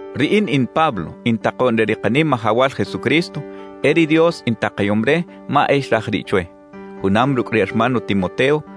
Riꞌin in Pablo in takoꞌn re ri Kanimajawal Jesucristo; e ri Dios intakayom re ma e xraj riꞌ chwe. Junam rucꞌ ri hermano Timoteo,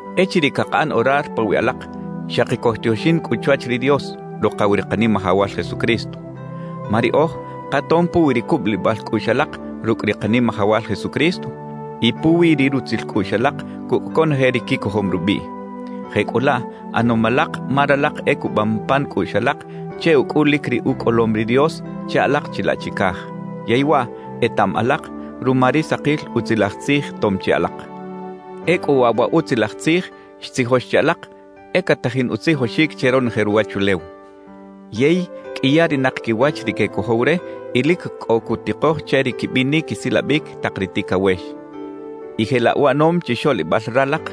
Echiriꞌ cakaꞌan orar pawiꞌ alak, xaki cojtioxin cꞌu chwach ri Dios, Rukaw ri Kanimajawal Jesucristo. Ma riꞌoj katom puwi ri cubulibal cꞌuꞌx alak rucꞌ ri Kanimajawal Jesucristo y puwi ri rutzil cꞌuꞌx alak cucꞌ conoje ri quicojom rubiꞌ. Jecꞌulaꞌ ꞌanom alak ma ralak e cubam pan cꞌuꞌx alak che ucꞌulic ri ucꞌolom ri Dios che alak chilaꞌ chicaj; yey waꞌ etaꞌam alak ruma ri sakil Utzilaj Tzij tom chi alak. Ecꞌu waꞌ wa Utzilaj Tzij xtzijox che alak, e catajin utzijoxic che ronoje ruwachulew. Yey qꞌuiyarinak quiwach ri quecojow re y lic cꞌo cutikoj che ri quibinic quisilabic tak ri ticawex. Y jelaꞌ uꞌanom chixoꞌlibal ralak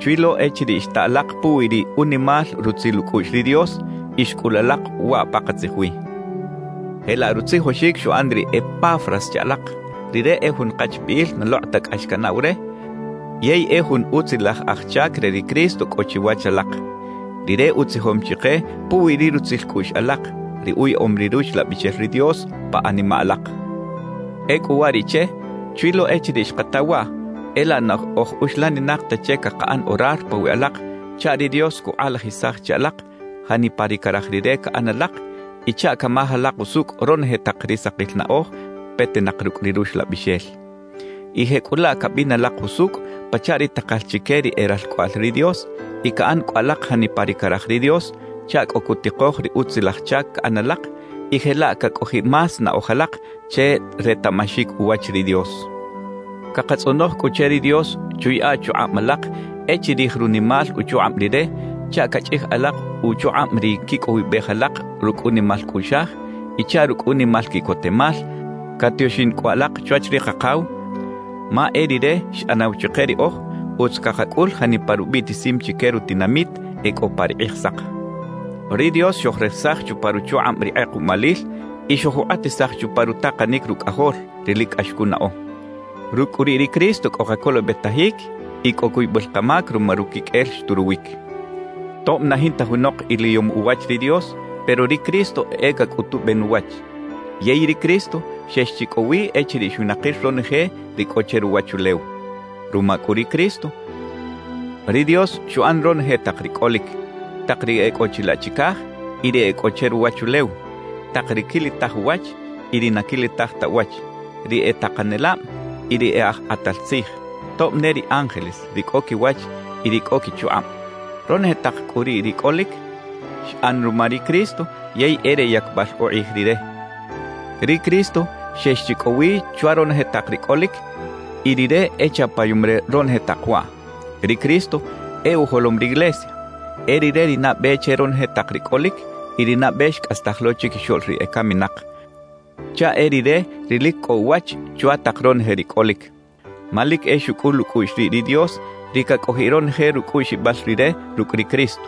chwi lo echiriꞌ xta alak puwi ri unimal rutzil ucꞌuꞌx ri Dios y xcꞌul alak waꞌ pakatzij wi. Jelaꞌ rutzijoxic xuꞌan ri Epafras che alak. Rire e jun kachbiꞌil na lokꞌ ta cꞌax canaꞌw re yey e jun utzilaj aj chac re ri Cristo cꞌo chiwach alak. Rire utzijom chike puwi ri rutzil cꞌuꞌx alak, ri uyaꞌom ri Ruxlabixel ri Dios pa animaꞌ alak. Ecꞌu uwariꞌche, chwi lo echiriꞌ xkata waꞌ, e laꞌ na oj uxlaninak ta che cakaꞌan orar pawiꞌ alak chaꞌ ri Dios cukꞌalajisaj che alak janipa ri caraj Rire caꞌan alak y chaꞌ camaj alak usucꞌ ronoje tak ri sakil naꞌoj petinak rucꞌ ri Ruxlabixel. Y jecꞌulaꞌ cabin alak jusucꞌ pachaꞌ ri takal chique ri e ralcꞌoꞌal ri Dios y caꞌan cꞌu alak janipa ri caraj ri Dios chaꞌ cꞌo cutikoj ri utzilaj chac caꞌan alak y jelaꞌ cacꞌojiꞌ más naꞌoj alak che retaꞌmaxic uwach ri Dios. Cakatzꞌonoj cꞌu che ri Dios chuyaꞌa chukꞌab alak e chirij runimal uchukꞌab Rire chaꞌ cachꞌij alak uchukꞌab ri quicꞌowibej alak rucꞌ unimal cꞌuꞌxaj y chaꞌ rucꞌ unimal quiꞌcotemal catioxin cꞌu alak chwach ri Kakaw, ma e Rire xꞌanaw chike riꞌoj utz cakacꞌul janipa rubiꞌtisim chique rutinamit e cꞌo pa ri Kꞌijsak. Ri Dios xojresaj chupa ruchukꞌab ri kꞌekuꞌmalil y xojukꞌatisaj chupa rutakanic Rucꞌajol, ri lic cꞌax cunaꞌo. Rucꞌ cꞌu riꞌ ri Cristo cꞌo kacolobetajic y cꞌo cuybal kamac ruma ruquiqꞌuel xturuwic. Tob na jinta junok iliyom uwach ri Dios, pero ri Cristo e cacꞌutuben uwach. Yey ri Cristo xex chi cꞌo wi echiriꞌ xwinakir ronoje ri cꞌo che ruwachulew. Ruma cꞌu ri Cristo, ri Dios xuꞌan ronoje tak ri cꞌolic: tak ri e cꞌo chilaꞌ chicaj y ri e cꞌo che ruwachulew, tak ri quilitaj uwach y ri na quilitaj ta uwach; ri e takanelab y ri e aj kꞌatal tzij, tob ne ri ángeles, ri cꞌo quiwach y ri cꞌo quichukꞌab. Ronoje tak cꞌu riꞌ ri cꞌolic, xꞌan ruma ri Cristo yey e re yacbal ukꞌij Rire. Ri Cristo xex chi cꞌo wi chwa ronoje tak ri cꞌolic y Rire e chapayom re ronoje tak waꞌ. Ri Cristo e ujolom riglesia. E Rire ri nabe che ronoje tak ri cꞌolic y ri nabe xcꞌastaj lo chiquixoꞌl ri ecaminak, chaꞌ e Rire ri lic cꞌo uwach chwa tak ronoje ri cꞌolic. Ma lic e xucꞌul ucꞌuꞌx riꞌ ri Dios ri cacꞌojiꞌ ronoje rucꞌuꞌxibal Rire rucꞌ ri Cristo.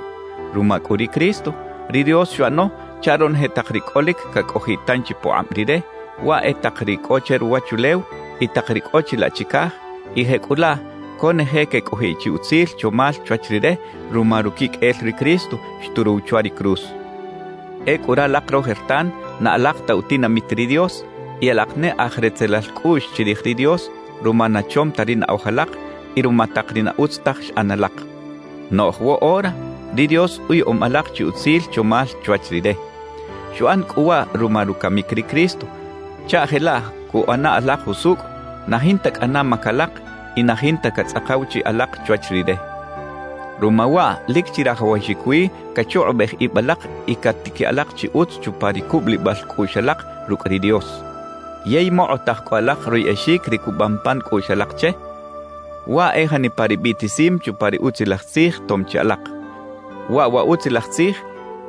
Ruma cꞌu ri Cristo, ri Dios xuꞌano chaꞌ ronoje tak ri cꞌolic cacꞌojiꞌ tanchi pukꞌab Rire, waꞌ e tak ri cꞌo che ruwachulew y tak ri cꞌo chilaꞌ chicaj, y jecꞌulaꞌ conoje quecꞌojiꞌ chi utzil chomal chwach Rire ruma ruquiqꞌuel ri Cristo xturuw chwa ri cruz. Ecꞌu ralak rojertan na alak ta utinamit ri Dios y alak ne aj retzelal cꞌuꞌx chirij ri Dios ruma na chom ta ri naꞌoj alak y ruma tak ri na utz taj xꞌan alak. Noꞌj woꞌora ri Dios uyaꞌom alak chi utzil chomal chwach Rire. Xuꞌan cꞌu waꞌ ruma rucamic ri Cristo chaꞌ jelaꞌ cuꞌana alak jusucꞌ, na jinta cꞌana mac alak y na jinta catzꞌakaw chiꞌ alak chwach Rire. Ruma waꞌ lic chirajawaxic wi cachukꞌubej ib alak y catiquiꞌ alak chi utz chupa ri cubulibal cꞌuꞌx alak rucꞌ ri Dios. Yey mokꞌotaj cꞌu alak royꞌexic ri cubam pan cꞌuꞌx alak che, waꞌ e janipa ri biꞌtisim chupa ri Utzilaj Tzij tom chi alak. Waꞌ wa Utzilaj Tzij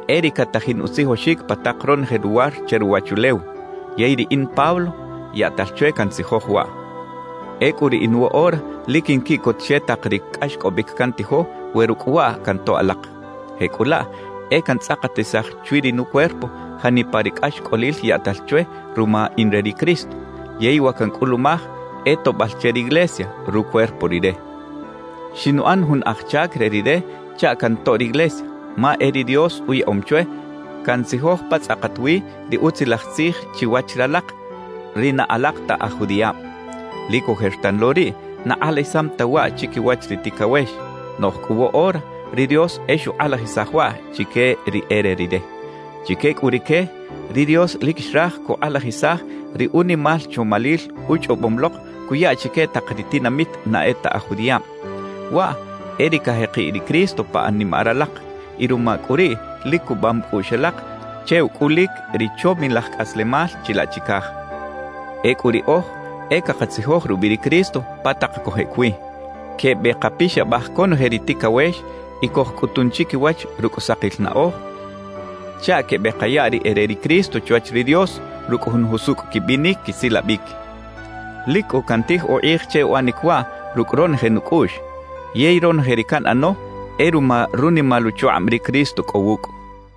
e ri catajin utzijoxic pa tak ronoje luwar che ruwachulew. Yey riꞌin Pablo, yaꞌtal chwe cantzijoj waꞌ. Ecꞌu riꞌin woꞌora lic quinquiꞌcot che tak ri cꞌaxcꞌobic cantijo we rucꞌ waꞌ cantoꞌ alak. Jecꞌulaꞌ e cantzꞌakatisaj chwi ri nucuerpo janipa ri cꞌaxcꞌolil yaꞌtal chwe ruma in re ri Cristo, yey wa cancꞌulumaj e toꞌbal che riglesia, rucuerpo Rire. Xinuꞌan jun aj chac re Rire chaꞌ cantoꞌ riglesia, ma e ri Dios uyaꞌom chwe cantzijoj pa tzꞌakat wi ri Utzilaj Tzij chiwach ralak ri na alak ta aj judiꞌab. Lic ojertan lo riꞌ na kꞌalajisam ta waꞌ chiquiwach ri ticawex, noꞌj cꞌu woꞌora ri Dios e xukꞌalajisaj waꞌ chique ri e re Rire. Chique cꞌu rique, ri Dios lic xraj cukꞌalajisaj ri unimal chomalil uchꞌobom lok cuya chique tak ri tinamit na e ta aj judiꞌab; waꞌ e ri cajekiꞌ ri Cristo pa animaꞌ ralak, y ruma cꞌu riꞌ lic cubam cꞌuꞌx alak che ucꞌulic ri chomilaj cꞌaslemal chilaꞌ chicaj. Ecꞌu riꞌoj e cakatzijoj rubiꞌ ri Cristo pa tak cojꞌec wi. Quebekapixabaj conoje ri ticawex y cojcꞌutun chiquiwach rucꞌ sakil naꞌoj, chaꞌ quebekaya ri e re ri Cristo chwach ri Dios rucꞌ jun jusucꞌ quibinic quisilabic. Lic cꞌu cantij ukꞌij che uꞌanic waꞌ rucꞌ ronoje nucꞌuꞌx, yey ronoje ri canꞌano e ruma runimal uchukꞌab ri Cristo cꞌo wucꞌ.